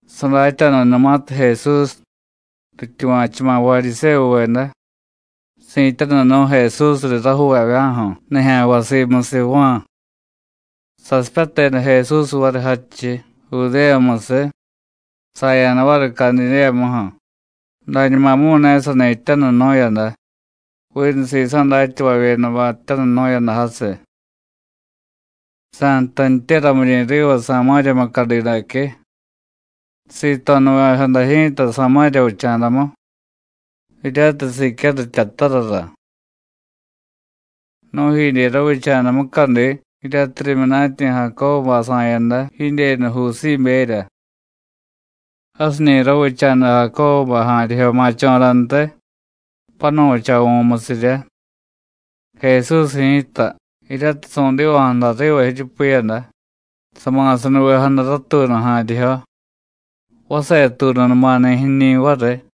Sadatya̱danumatiy Jesús: “Rityuva̱chuma̱ Varyisévuveda: Si̱tyanunu̱y Jesús riy rajuuvavya̱ju̱ nijya̱nvay simusiy Juán,” sasipyateda Jesús variy jadchiy, Judéyamusiy, saya̱da variy Cadidéyamuju̱, dañumamu̱y ne sani jtyanunu̱yada, vinu sisa̱ datyavavyedabay jtyanunu̱yada jasiy. Sa̱jtantye ramiryi̱ riva Samáriya mucadi daque. Sito̱nuvejada ji̱ta Samáriya vicha̱damu, jiryatiy Sicyáru jtyatarara. Nu̱jidye ravicha̱da mucadi jiryatiy rimyunatyi̱ Jacóbubay sa̱yada jidyenu Jusíberya. Jasiñi̱ ravicha̱da Jacóbubay ja̱a̱ryijyo ma̱cho̱rantiy, panu̱chavu̱musiryá. Jesús ji̱ta, jiryatiy su̱diva̱jada riva jiryupiyada, sama̱sanuvejada ratuunu ja̱a̱ryijyo, vasetuununumani̱ jiñi̱ variy.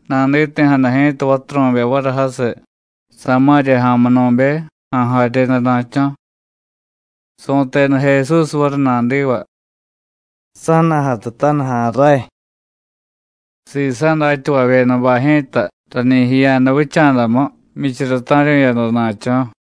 Naditi̱jada ji̱ta vaturu̱be variy jasiy, Samáriya ja̱munu̱be, ja̱a̱ jaryedana̱cho̱. Su̱teda Jesús variy nadiva: “Sa̱na̱jatutaniy ja̱a̱ ray.” Sisa̱ datyavavyedabay ji̱ta rañi jiya̱da vicha̱damu, jmyichara ta̱ryu̱yada na̱cho̱.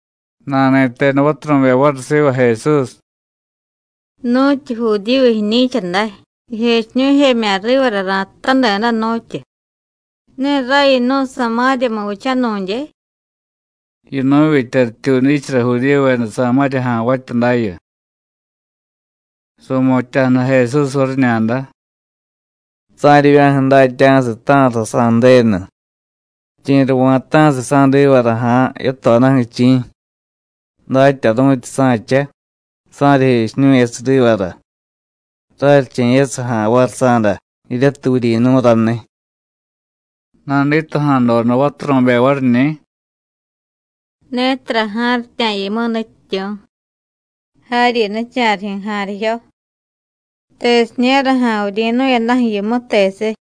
Nani̱teda vaturu̱be variy siva Jesús: “¿Nu̱tyu Judíyu jiñi̱cha day, jijechiñu̱jemya̱ rivara ra̱tutadeda, nu̱tyu? ¡Ne ray yinu̱y Samáriyamu vichanu̱dye!” Yinu̱vitya rityuudichara Judíyuveda Samáriya ja̱nvatya dayu. Su̱mutya̱jada Jesús variñada: “Sa̱ryivya̱ju̱ datya̱siy ta̱ra sasa̱y Ju̱denu, chi̱ra va̱ta̱siy sa̱divara ja̱a̱ yatodaju̱, chi̱, datyaru̱tyi sa̱cha, sa̱ryijechiñu̱yasiy rivara, raryiche̱yasiy ja̱a̱ variy sa̱da, jiryatiy vuryi̱nu̱y raniy.” Naditaja̱doda vaturu̱be variñi̱: “Ne tara ja̱a̱ryitya̱ yimu, Nutyityu̱, jaryi nicha̱rijyu̱ ja̱a̱ryijyo. ¿Tesiña̱ra ja̱a̱ vuryi̱nu̱yadaju̱ yimu, tesiy?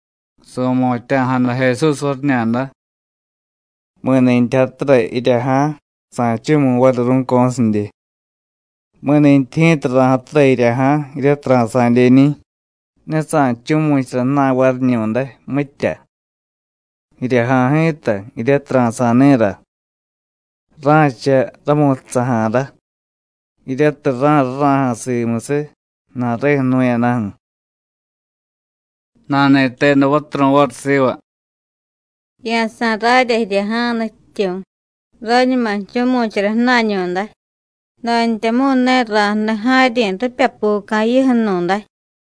Su̱mutya̱jada Jesús variñada: “Mi̱ni̱tyi jatura jirya ja̱a̱, sa̱jchu̱mu̱y variy ru̱co̱sidye. Mi̱nintyi ji̱ta ra̱jatura jirya ja̱a̱ jiryatiy ra̱sa̱dyeñi̱, ne sa̱jchu̱mu̱chara ju̱na̱y variñu̱day, mitya. Jirya ja̱a̱ ji̱ta jiryatiy ra̱sa̱y ni̱ra, ra̱cha rámu̱tsaja̱rá, jiryatiy rá̱rurá̱ja̱ simusiy ju̱na̱reju̱ jnu̱yadaju̱.” Nani̱teda vaturu̱y variy siva: “Ya̱sa̱y rarya jirya ja̱a̱, Nutyityu̱, rañuma jchu̱mu̱chara ju̱na̱ñu̱day, dantyamu̱y ne ra̱jniy ja̱a̱ryi̱ ripyapuca̱ jiyuju̱nu̱day.”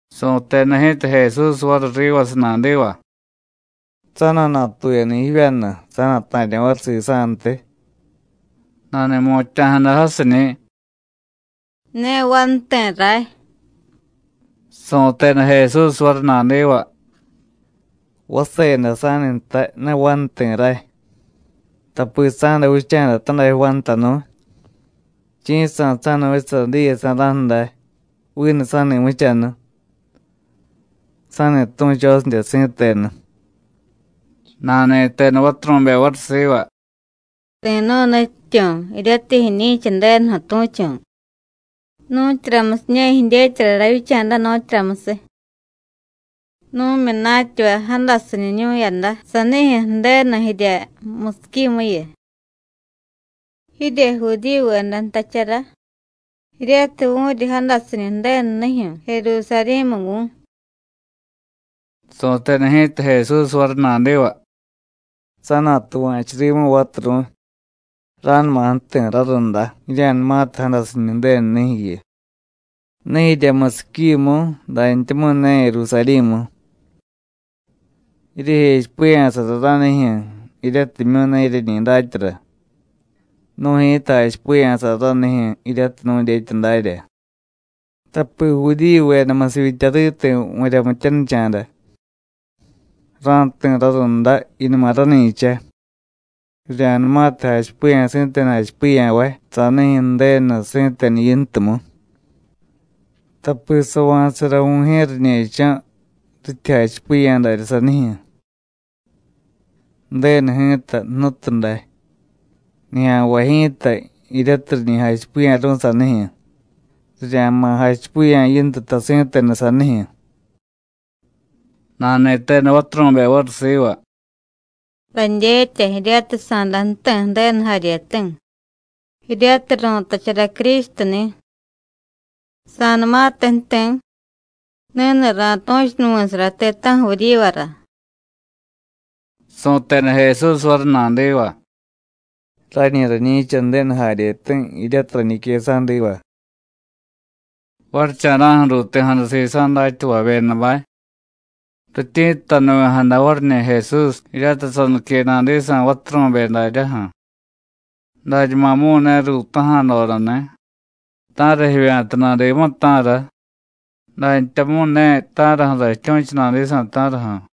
Su̱teda ji̱ta Jesús variy rivasiy nadiva: “Sa̱na̱natuyani̱ jivyanu, sa̱na̱ta̱ryo̱ variy sisa̱ntiy.” Nani̱mutya̱jada jasiñi̱: “Ne vanuti̱ ray.” Su̱teda Jesús variy nadiva: “Vase day sa̱ni̱tay: Ne vanuti̱ ray. Tapi sa̱da vicha̱da tadajyo vanutanu̱y. Chi̱jsa̱ sa̱da vichasara diyesa̱ra̱ju̱ day vinu sa̱ni̱muchanu. Sa̱ni tu̱chosidye si̱tenu.” Nani̱teda vaturu̱be variy siva: “Ri̱nu̱y, Nutyityu̱, jiryatiy jiñi̱cha Ju̱denuju̱ tu̱chu̱. ¿Nu̱tyuramusiña̱ jidyetyara ravyicha̱da, nu̱tyuramusiy? Nu̱myunatyavay jadasiñunu̱yada sanijyu̱ Ju̱denu jirya musiquimuyu. Jirye Judíyuveda jtachara jiryatiy vu̱ryi jadasiñu Ju̱denu nijyu̱ Jerusarí̱mu vu̱y.” Su̱teda ji̱ta Jesús variy nadiva: “Sa̱na̱tuva̱chu rimu, vaturu̱y, ra̱numa ju̱ti̱ rarunda jirya̱numatiy jadasiñu Ju̱denu nijyu̱yu, ne jirya musiquimu, dantyamu̱y ne Jerusarí̱mu. Jiryejechipiya̱sara ranijyu̱ jiryatimyu̱ ne jiryeñi datyara. Nu̱y ji̱ta jachipiya̱sara ranijyu̱ jiryatiy nu̱dyetya darya, tapi Judíyuveda musivyitya riti̱ vu̱ryamityanicha̱da. Ra̱jti̱ rarunda, jiyunuma rani̱cha, rirya̱numatiy jachipiya̱ si̱tenu jachipiya̱vay sanijyu̱ Ju̱denu si̱tenu yintumu, tapi sava̱tasara Vu̱jye̱ riñe̱cho̱ rityi jachipiya̱ daryá sanijyu̱. Ju̱denu ji̱ta jnutu day, nijya̱nvay ji̱ta jiryatiy riñi jachipiya̱ru̱y sanijyu̱, rirya̱ma̱ jachipiya̱ yintuta si̱tenu sanijyu̱.” Nani̱teda vaturu̱be variy siva: “Radyetya jiryatiy sa̱day ju̱ti̱ Ju̱denu jaryeti̱ (jiryatiy ru̱tachara Crístuni̱). Sa̱numatiy ju̱ti̱, ni̱ni̱ ra̱tu̱chunuvi̱sara ti̱ta̱ju̱ vuryivara.” Su̱teda Jesús variy nadiva: “Rañi rañi̱cha Ju̱denu jaryeti̱, jiryatiy rañique sa̱diva.” Varicha̱ra̱ju̱ ruuti̱jada sisa̱ datyavavyedabay. Rityi̱ttanuvi̱jada variñi̱ Jesús, jiryatiy sanique nadisa̱ vaturu̱be daryaju̱. Dañumamu̱y ne ruutaja̱dodani̱: “¿Ta̱ra jivya̱ta nadimu, ta̱ra?” dantyamu̱y ne: “¿Ta̱raju̱ra jityu̱chu nadisa̱, ta̱raju̱?”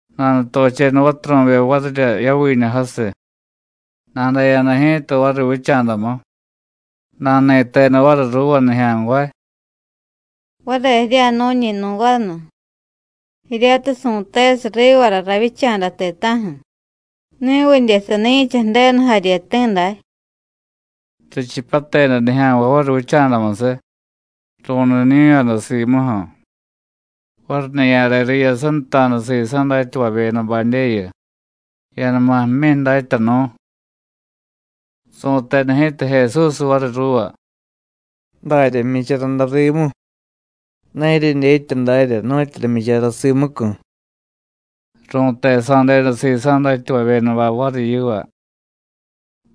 Nanutocheda vaturu̱be varirya yaviñu jasiy, nadaya̱da ji̱ta variy vicha̱damu. Nani̱teda variy ruuva nijya̱nvay: “Vare jirya̱jnu̱ñi̱ nu̱ vanu jiryatiy su̱tesiy rivara ravyicha̱da ti̱ta̱ju̱. ¿Ni̱vidye sani̱cha Ju̱denu jaryeti̱ day?” Richipyateda nijya̱nvay variy vicha̱damusiy, ru̱niñu̱yada simuju̱. Variñiya̱re riyasanta̱da sisa̱ datyavavyedabadyeyu: “Ya̱numa jmyi, Datyanu̱.” Su̱teda ji̱ta Jesús variy ruuva: “Darya jmyichara day rimu, ne jiryedyetya dárya nu̱tyura jmyichara simucu̱.” Ru̱tesa̱deda sisa̱ datyavavyedabay variy yiva: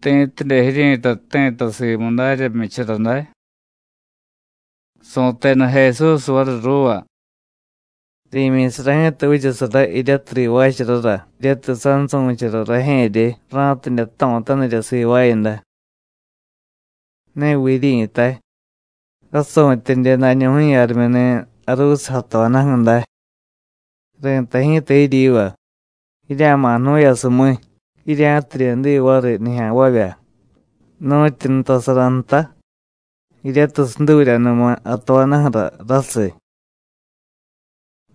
“¿Ti̱tidye jiryi̱tay jti̱ta simu darya jmyichara day?” Su̱teda Jesús variy ruuva: “Ri̱myi̱sara ji̱ta vichasara jiryatiy rivaacharara jiryatiy sansu̱chara rajye̱rye, ra̱tidye jto̱tanirya sivaayada. ¿Ne viy jiryi̱tay: Rasu̱tyedye dañuju̱yu jarimyuni̱ jaruusiy jatojadaju̱ day? Ri̱tay ji̱ta jiryiva: Jirya̱ma̱ jnu̱yasumíy, jirya̱tidye diy variy nijya̱nvavya nu̱tyu nutasara nta jiryatiy suduryanuma jatojadaju̱ra rasiy.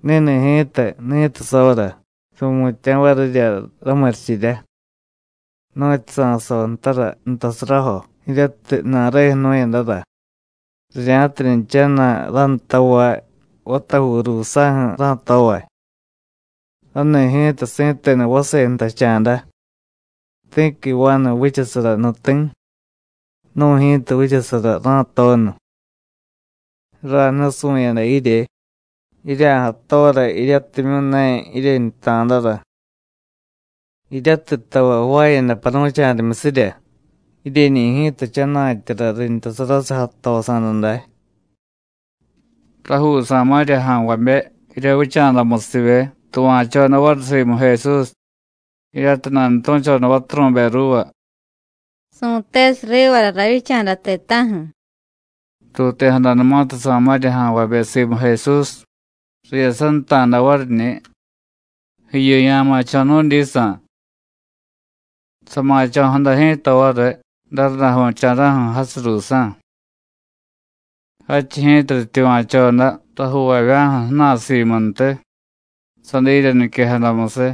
Ni̱ni̱ ji̱ta ni̱tiy soora, su̱mutya̱ varirya ramurichirya, nu̱tyu sa̱soo ntara nutasarajo jiryatiy ju̱na̱reju̱ jnu̱yadara, rirya̱tidye jchana̱y rántavay vatajuu ruusa̱ju̱ ra̱tovay. Rani̱ ji̱ta si̱tenu vase jtacha̱da: Ti̱qui vanu vichasara nuti̱, nu̱ ji̱ta vichasara rá̱toonu. Ray nusu̱yada jirye, jirya̱jatora jiryatimyu̱ ne jiryeñuta̱dara. Jiryatiy tavay jvaayada paru̱cha̱rimyusirya, jiryeñi̱ ji̱ta jchana̱tyara rintarasiy jatosa̱da day.” Rajuu Samáriya ja̱nvabe jirya vicha̱damusivye tuva̱choda variy simu Jesús, jiryatiy nanutu̱choda vaturu̱be ruuva: “Su̱tesiy rivara ravyicha̱da ti̱ta̱ju̱.” Ruuti̱jadanumatiy Samáriya ja̱nvabe simu Jesús, riyasanta̱da variñi̱: “Jiyu ya̱ma̱cho̱ nu̱dyisa̱.” Sama̱cho̱jada ji̱ta variy darundaju̱cha̱ra̱ju̱ jasiy ruusa̱. Jadchiy ji̱ta rityuva̱choda rajuuvavya̱ju̱ ju̱na̱y simuntiy, sadirya niquejadamusiy.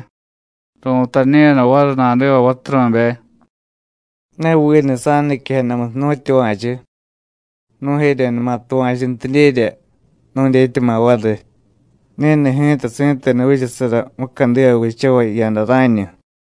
Ru̱tañu̱yada variy nadiva vaturu̱be: “Ne vinu sa̱nuniquejadamusiy nu̱tyuva̱chu. Nu̱jeryenuma tuva̱chuntidyerya, nu̱dyetyama̱ variy: Ni̱ni̱ ji̱ta si̱tenu vichasara mucadiva vichavay jiyada rá̱ñu.”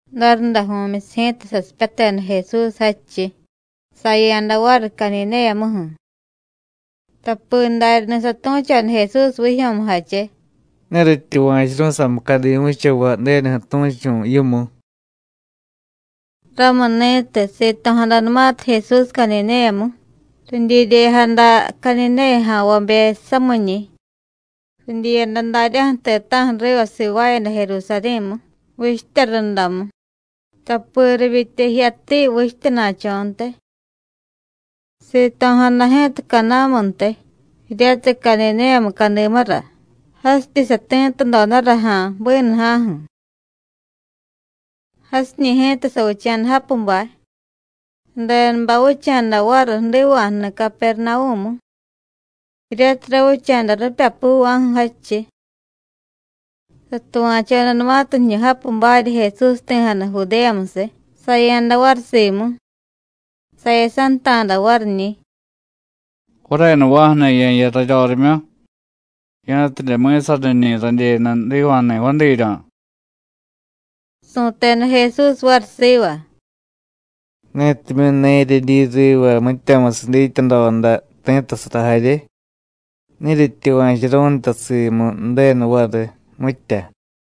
Darundaju̱myusiy ji̱ta sasipyateda Jesús jadchiy, saya̱da variy Cadidéyamuju̱. Tapi daryani̱ satu̱choda Jesús vijyo̱mujache: “Ne rityuva̱churu̱y samucadimu vichavay Ju̱denuju̱ tu̱chu̱ yimu.” Ramuni̱tiy sito̱jadanumatiy Jesús Cadidéyamu, ridyiryejada Cadidéya ja̱nvabe samiñi̱, ridyiyada daryaju̱ ti̱ta̱ju̱ riva sivaayada Jerusarí̱mu, vichtya rundamu, tapi rivyitya jiyatiy vichtyana̱cho̱ntiy. Sito̱jada ji̱ta Caná̱muntiy, jiryatiy Cadidéya mucadimura, jasityi sati̱tudodara ja̱a̱ bínuja̱ju̱. Jasiñi̱ ji̱ta savicha̱da japubay. Sadenubay vicha̱da variy jdiva̱jni̱ Capernavú̱mu, jiryatiy ravicha̱da ripyapuva̱ju̱ jadchiy. Satuva̱chodanumatiy jiñu japubarya Jesús jti̱jada Judéyamusiy, saya̱da variy simu. Sayasanta̱da variñi̱: “Varenuva̱ju̱ni̱ ye̱jiya raryorimyu, ya̱tidye mi̱saniñi̱ radyenu jdiva̱jni̱ vadiiryo̱.” Su̱teda Jesús variy siva: “Netimyu̱ ne jiryedyi riva mityamusiy dityadoda, ti̱ttasara jarye, ne jiryetyuva̱churu̱y nta simu Ju̱denu variy, mitya.”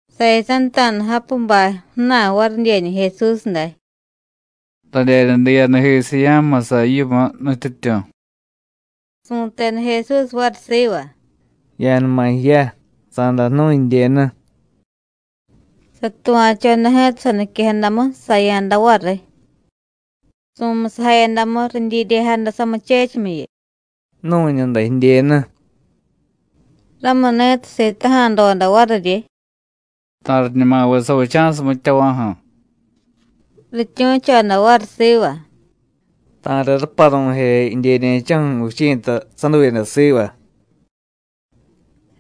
Sayasanta̱da japubay ju̱na̱y varidyeñi̱ Jesús day: “Radyenu diiyadajisiy ya̱jmusa yimu, Nutyityu̱.” Su̱teda Jesús variy siva: “Ya̱numa jiya, sa̱day jnu̱y jidyenu.” Satuva̱choda ji̱ta saniquejadamu, saya̱da variy. Su̱musajayadamu, ridyiryejada samuchechimyiyu: “Ju̱nu̱ñu day jidyenu.” Ramuni̱tiy sitaja̱doda variryi: “¿Ta̱riñumaviy savicha̱siy mityava̱ju̱?” Rityu̱choda variy siva: “Ta̱riy raparu̱je jidyeñe̱cho̱ju̱ vichi̱ta saduyada siva.”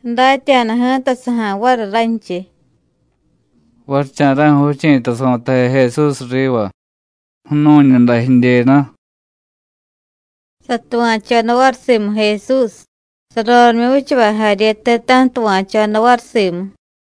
Sadatya̱da ji̱ta saja̱y variy ranchiy: “Varicha̱ra̱ju̱ vichi̱ta su̱taje Jesús riva: ‘Ju̱nu̱ñu day jidyenu.’” Satuva̱choda variy simu Jesús, sarorimyu vichavay jarye ti̱ta̱ju̱ tuva̱choda variy simu.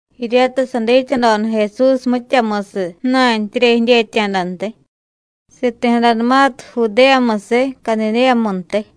Jiryata sadityadoda Jesús mityamusiy ju̱na̱ntyirya jidyetya̱dantiy, siti̱jadanumatiy Judéyamusiy Cadidéyamuntiy.